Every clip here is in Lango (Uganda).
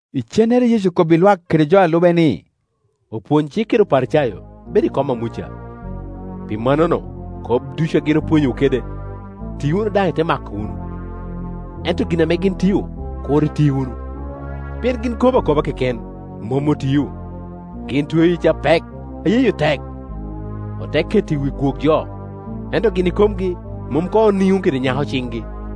Icennere Yecu okobbi lwak kede jo a lube ni, “Opwony cik kede Oparicayo bedo i kom a Muca; pi mannono kop ducu ame gin pwonyowu kede, ti wunu daŋ ite mako wunu, ento gin ame gin tio, kur iti wunu; pien gin kobo akoba keken, mom otio. Gin tweo yec apek, a yeyo tek, ote keto i wi gwok jo, ento gin ikomgi mom koŋ oniŋo kede nyako ciŋgi.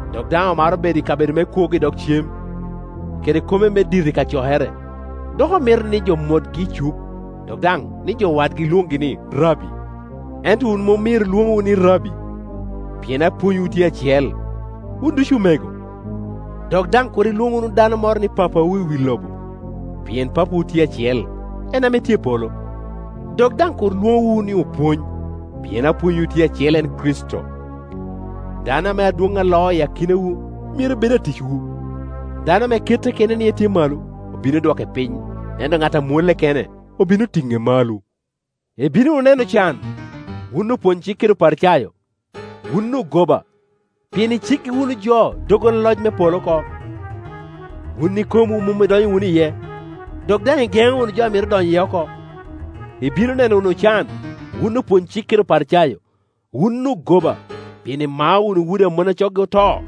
dok daŋ omaro kabedo me kwogo i dog cem, kede kome me dito i kacokere, dok omito ni jo motgi i cuk, dok daŋ ni jo wadgi lwongi ni, Rabbi. Ento wun mom myero lwoŋwu ni, Rabbi, pien apwonywu tye acel, wun ducu omego. Dok daŋ kur ilwoŋ wunu dano moro ni papawu i wi lobo, pien Papawu tye acel, en ame tye i polo. Dok daŋ kur lwoŋowu ni opwony, pien apwonywu tye acel, en Kricito. Dano ame adwoŋ a loo i akinawu myero bed aticwu. Dano ame kette kene ni etye malo, obino dwoke piny, ento ŋat a mwolle kene, obino tine malo. “Ibino wunu neno can, wun opwony-cik kede Oparicayo, wun ogoba! Pien iceggi wunu jo doggola loc me polo oko; wun ikomwu mom idonyo wunu iye, dok daŋ igeŋo wunu jo a mito donyo iye oko. [ Ibino neno wunu can, wun opwony-cik kede Oparicayo, wun ogoba! Pien imao wunu udi a mon a coggi oto,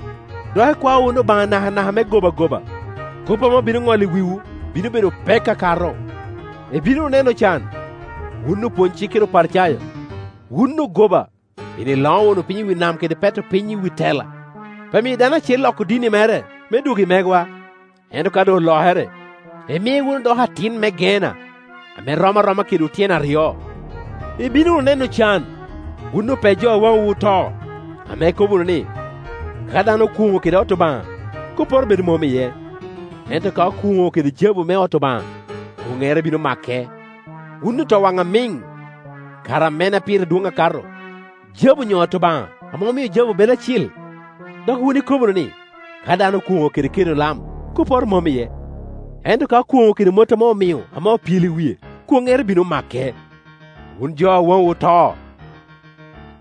dok ikwao wunu Obaŋa nakanaka me gobagoba; kop ame obino ŋolo i wiwu bino bedo pek akato.] Ibino wunu neno can, wun opwonycik kede Oparicayo, wun ogoba! Pien iloŋo wunu piny i wi nam kede peto piny i wi tela pi miyo dano acel loko dini mere me dwog i megwa, ento ka doŋ olokere, imie wunu doko atin me Geena ame rom aroma kedwu tyen aryo. “Ibino wunu neno can, wun ope jo a waŋwu oto, ame ikobo wunu ni, ‘Ka dano okwoŋo kede ot Obaŋa, kopporo bedo mom iye, ento ka okwoŋo kede jabu me ot Obaŋa, kwoŋŋere bino make,’ Wun otowaŋ amiŋ! Kara mene a pire dwoŋ akato, jabu onyo ot Obaŋa ame omio jabu bedo acil? Dok wun ikobo wunu ni, ‘Ka dano okwoŋo kede keno lam, kopporo mom iye, ento ka okwoŋo kede mot ame omio ame opyelo i wie, kwoŋŋere bino make,’ Wun jo a waŋwu oto!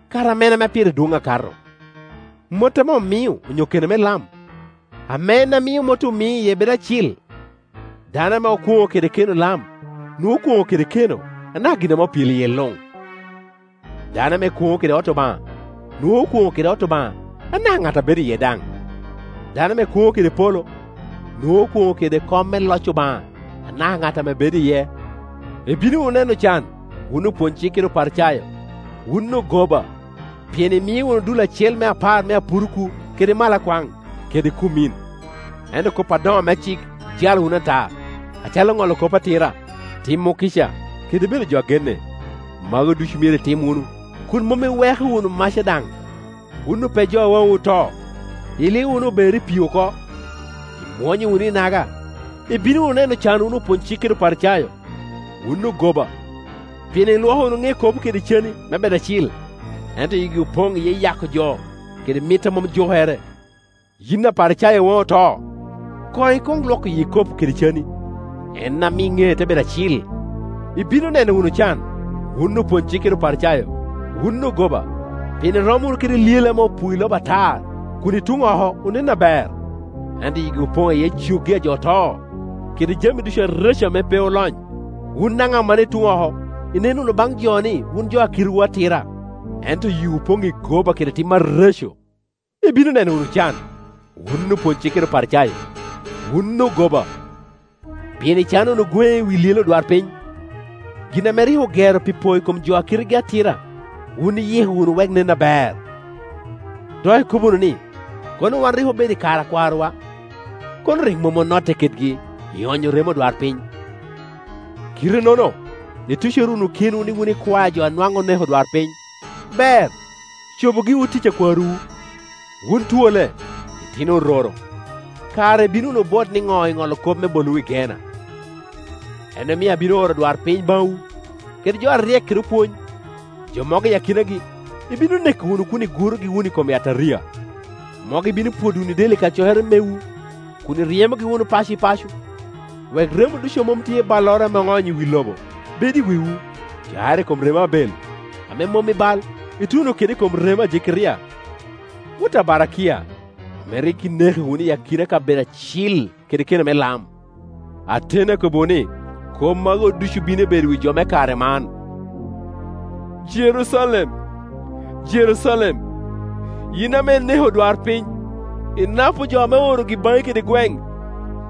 Kara mene ame pire dwoŋ akato, mot ame omio onyo keno me lam, ame en a mio mot omio iye bedo acil? Dano ame okwoŋo kede keno me lam, nwoŋo okwoŋo kede keno anaka gin ame opyelo iye luŋ. Dano ame kwoŋo kede ot Obaŋa, nwoŋo okwoŋo kede ot Obaŋa anaka ŋat a bedo iye daŋ. Dano ame kwoŋo kede polo, nwoŋo okwoŋo kede kom me loc Obaŋa anaka ŋat ame bedo iye. “Ibino wunu neno can, wun opwony-cik kede Oparicayo, wun ogoba! Pien imio wunu dul acel me apar me apuruku kede malakwaŋ kede kummin, ento kop adoŋo me cik ijalo wunu ata, acalo ŋolo kop atira, timo kica kede bedo jo a genne. Magu ducu myero itim wunu, kun mom iweko wunu maca daŋ. Wun ope jo a waŋwu oto, ilio wunu ober i pii oko, imwonyo wunu inaga! “Ibino wunu neno can wun opwony-cik kede Oparicayo, wun ogoba! Pien ilwoko wunu ŋe ikopo kede cani me bed acil, ento yigi opoŋ iye yako jo kede mit a mom jukere. Yin Aparicayo a waŋi oto, koŋ ikwoŋ lwoko yi ikopo kede cani, en ami ŋee te bedo acil. “Ibino neno wunu can, wun opwony cik kede Oparicayo, wun ogoba! Pien irom wunu kede lyele ame opuo i loba atar, kun i tuŋ oko onen aber, ento yigi opoŋ iye coggi a jo oto, kede jami ducu areco ame pe olony. Wun daŋ amannono i tuŋ oko inen wunu baŋ jo ni wun jo a kitewu atira, ento yiwu opoŋ i goba kede tim areco. “Ibino neno wunu can, wun opwony-cik kede Oparicayo, wun ogoba! Pien icano wunu gweŋe i wi lyelle odwarpiny, gin ame rik ogero pi po i kom jo a kitegi atira wun iyiko wunu wek nen aber, dok ikobo wunu ni, ‘Kono wan rik obedo i kare a kwarowa, kono rik mom onotte kedgi ioonyo remo odwarpiny.’ Kite-nono itucere wunu kenwu ni wun ikwae a jo a nwaŋ oneko odwarpiny. “Ber, cobu giwu tic a kwarowu. Wun twolle, itino ororo, kara ibino wunu bwot niŋo i ŋolo kop me bolowu i Geena? En omio abino oro odwarpiny baŋwu, kede jo aryek, kede opwony. Jo mogo i akinagi ibino neko wunu kun igurogi wunu i kom yataria, mogo ibino pwodo wunu i del i kacokere mewu kun iryemogi wunu paco i paco; Tek. 24.20-21wek remo ducu a mom tye i balloro ame oonyo i wi loba bed i wiwu, cakere i kom remo Abel ame mom i bal ituno kede i kom remo a Jekeria wot a Barakia, ame rik ineko wunu i akina kabedo acil kede keno me lam. Ateni akobbiwu ni, kop magu ducu bino bedo i wi jo me kare man. “Jerucalem, Jerucalem, yin ame ineko odwarpiny, inapo jo ame oorogi baŋi kede gweŋ,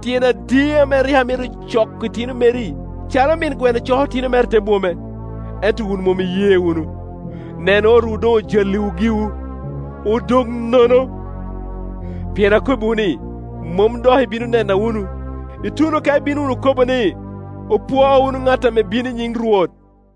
tyen adi ame rik amito coko itino meri calo min gweno coko itino mere i te bwome, ento wun mom iye wunu! Nen otwu doŋ ojalliwu giwu, odoŋ nono. Pien akobbiwu ni, mom dok ibino nena wunu, ituno ka ibino wunu kobo ni, ‘Opwo wunu ŋat ame bino i nyiŋ Rwot!’”